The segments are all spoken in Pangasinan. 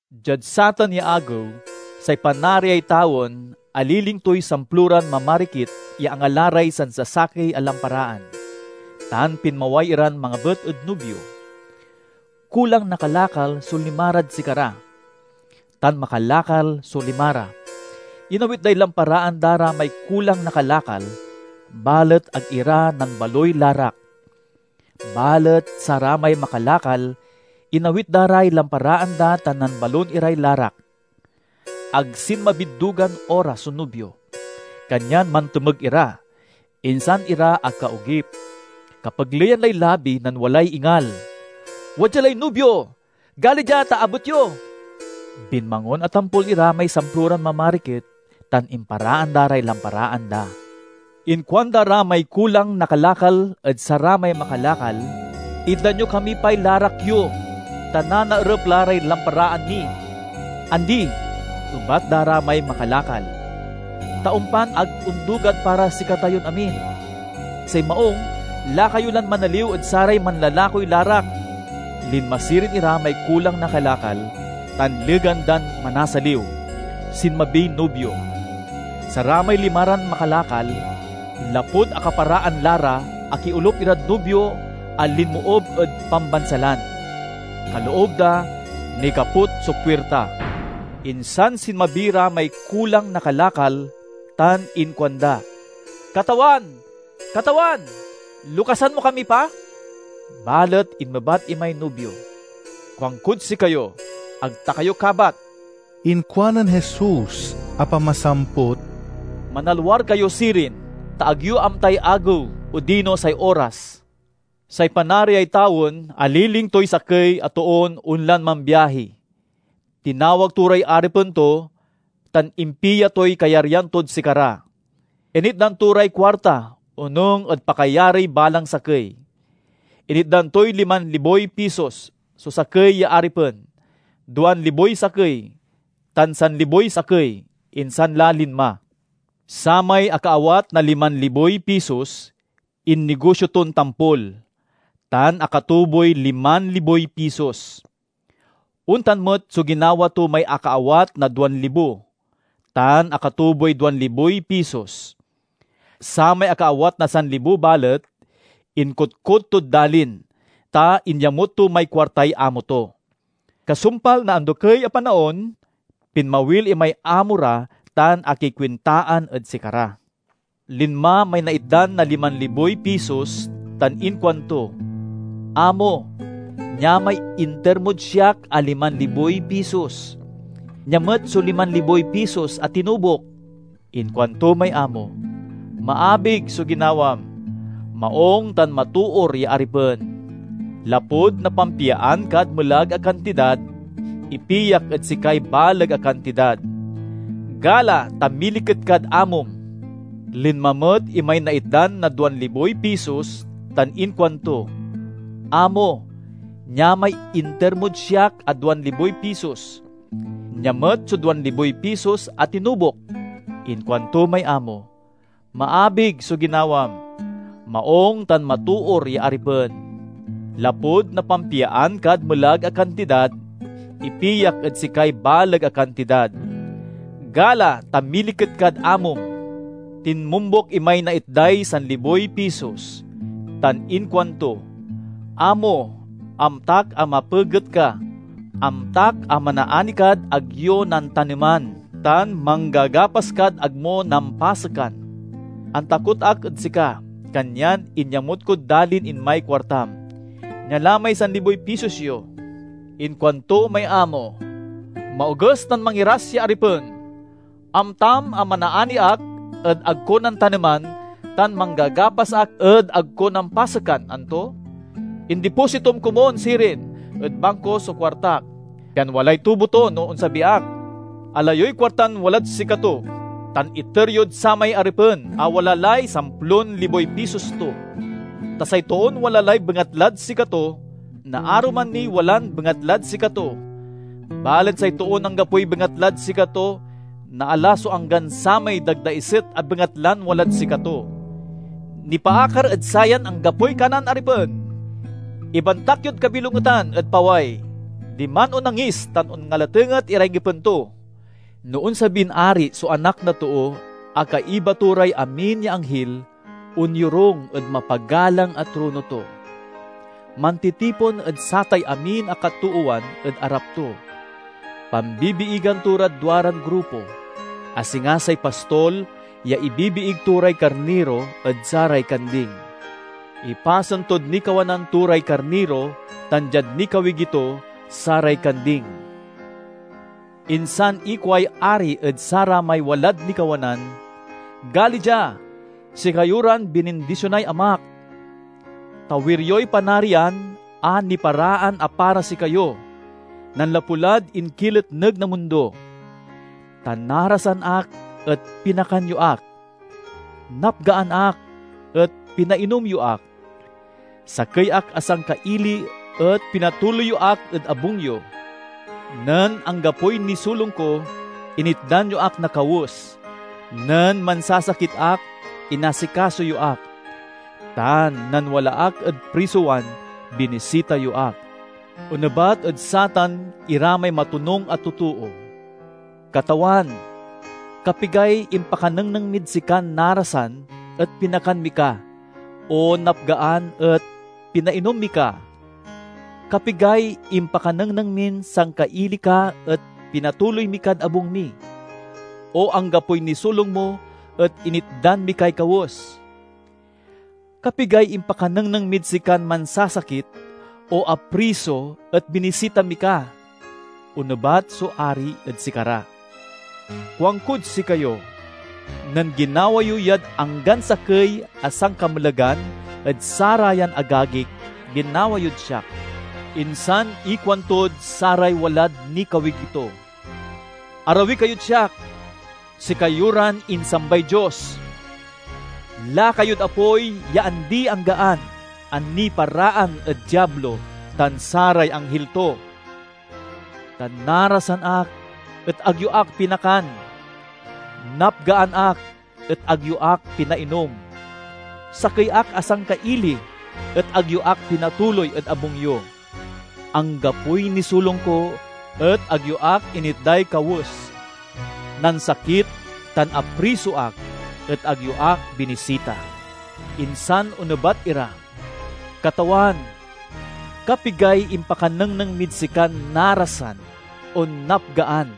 "Diad satan ya agew, say Panariay tawen aliling toy samploran mamarikit ya angala ray sansasakey a lamparaan, tan pinmaway iran mangabet ed nubio. Kulang na kalakal so limarad sikara, tan makalakal so limara. Inawit day lamparaan da ra may kulang na kalakal, balet ag ira nambaloy larak. Balet saramay makalakal inawit da ray lamparaan da tan nambalon iray larak. Ag sinmabid dugan oras so nubio, kanyan mantomeg ira, insan ira akaogip. "Kapegleyan lay labi nen walay ingal, 'Wadya lay nubio! Gali dia ta abet yo!' Binmangon a tampol ira may samploran mamarikit tan imparaan da ray lamparaan da. Inkuanda ra may kulang na kalakal ed saramay makalakal. 'Itdan yo kami pay larak yo, ta nanaerep la ray lamparaan mi.' 'Andi,' ebat da ra may makalakal, 'ta ompan ag ondugad para sikatayon amin. Say maung lakayo lan manaliw ed saray manlalakoy larak.' Linma sirin ira may kulang na kalakal tan legan dan manasaliw, sinmabiy nubio. Saramay limaran makalakal, lapud akaparaan la ra, akiolup irad nubio a linmoob ed pambansalan. Kaloob da, nikaput so puirta. "Insan sinmabi ra may kulang na kalakal tan inkuanda, 'Katawan, katawan, lokasan mo kami pa!' Balet inmebat imay nubio, 'Kuankod sikayo, ag ta kayo kabat!'" Inkuanen Jesus a pamasamput, "Manalwar kayo sirin, ta ag yo amtay agew odino say oras." "Say Panariay tawen aliling toy sakey a toon onlan mambiahi. Tinawag to ray aripen to tan impia toy kayaryan tod sikara. Initdan to ray kuarta onung ed pakayariy balang sakey. Initdan toy liman liboy pisos so sakey ya aripen, duan liboy sakey, tan sanliboy sakey. Insan la linma. Samay akaawat na liman liboy pisos innigosio ton tampol, tan akatuboy liman liboy pisos. Ontan met so ginawa to may akaawat na duan libo, tan akatuboy duan liboy pisos. Samay akaawat na sanlibo balet, inkotkot tod dalin, ta inyamut to may kuartay amo to. "Kasumpal na andokey a panaon, pinmawil imay amo ra tan akikuintaan ed sikara. Linma may naitdan na liman liboy pisos tan inkuanto, 'Amo, nia may inter mod siak a liman liboy pisos. Nia met so liman liboy pisos a tinubok!' Inkuanto may amo, 'Maabig so ginawam, maung tan matoor ya aripen! Lapud napampiaan kad melag a kantidad, ipiak ed sikay baleg a kantidad. Gala, ta miliket kad amom!' Linma met imay naitdan na duan liboy pisos tan inkuanto, 'Amo, nia may inter mod siak a duan liboy pisos. Nia met so duan liboy pisos a tinubok!' Inkuanto may amo 'Maabig so ginawam, maung tan matoor ya aripen! Lapud napampiaan kad melag a kantidad, ipiak ed sikay baleg a kantidad. Gala, ta miliket kad amom!' Tinmombuk imay naitday sanliboy pisos, tan inkuanto, 'Amo, amtak a mapeget ka. Amtak a manaani kad ag yo nantaneman, tan manggagapas kad ag mo nampasekan. Antakot ak ed sika, kanyan inyamut kod dalin, imay kuartam. Nia la may sanliboy pisos yo!' Inkuanto may amo, 'Maoges tan mangiras ya aripen! Amtam a manaani ak ed ag ko nantaneman tan manggagapas ak ed ag ko nampasekan, anto? Indipositom komun sirin ed bangko so kuartak, pian walay tubo to no onsabi ak. Ala yoy kuartan walad sikato tan iter yod samay aripen a wala lay samplon liboy pisos to. Ta say toon wala lay bengatlad sikato, naaruman niy walan bengatlad sikato; balet say toon anggapoy bengatlad sikato, naala so anggan samay dagdaiset a bengatlan walad sikato. Nipaakar ed sayan anggapoy kanan aripen, ibantak yod kabilongetan ed paway. Diman onnangis tan onngalatenget iray ngipen to.'" "No onsabin Ari so Anak na Too a kaiba to ray amin ya anghil, onyorung ed mapagalang a trono to. Mantitipon ed satay amin a katoowan ed arap to. Pambibiigan to rad duaran grupo, a singa say pastol ya ibibiig to ray karniro ed saray kanding. Ipasen tod nikawanan to ray karniro tan diad nikawigi to, saray kanding. Insan ikuay Ari ed saramay walad nikawanan, 'Gali dia, sikayo ran binindisionay Amak! Tawir yoy panarian a niparaan a para sikayo, nanlapu lad inkiletneg na mundo. Ta narasan ak et pinakan yo ak, napgaan ak et pinainom yo ak, sakey ak a sangkaili et pinatuloy yo ak ed abung yo. Nen anggapoy nisulong ko initdan yo ak na kawes, nen mansasakit ak inasikaso yo ak, tan nen wala ak ed prisowan binisita yo ak.' Onebat ed satan ira may matonung a totoo, 'Katawan, kapigay impakanengneng mid sikan narasan et pinakan mi ka, o napgaan et pinainom mi ka? Kapigay impakanengneng min sangkaili ka et pinatuloy mi kad abung mi, o anggapoy nisulong mo et initdan mi kay kawes? Kapigay impakanengneng mid sikan mansasakit o apriso et binisita mi ka?' Onebat so Ari ed sikara, 'Kuankod sikayo: nen ginawa yo yad anggan sakey a sankamelagan ed sarayan agagik, ginawa yod siak!' "Insan ikuantod saray walad nikawigi to, 'Arawi kayod siak, sikayo ran insambay Dios! Lakayod apoy ya andi-anggaan a niparaan ed Diablo tan saray anghil to! Ta narasan ak et ag yo ak pinakan, napgaan ak et ag yo ak pinainom. Sakey ak a sangkaili et ag yo ak pinatuloy ed abung yo. Anggapoy nisulong ko et ag yo ak initday kawes. Nansakit tan apriso ak et ag yo ak binisita.' Insan onebat ira, 'Katawan, kapigay impakanengneng mid sikan narasan o napgaan,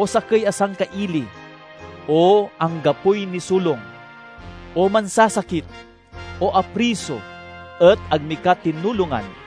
o sakey a sangkaili, o anggapoy nisulong, o mansasakit, o apriso, et ag mi ka tinulongan?'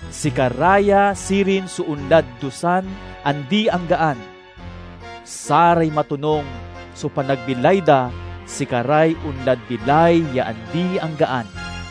Sikara ya sirin so onlad dusan andi-anggaan; saray matonung so panagbilay da sikaray onlad bilay ya andi-anggaan."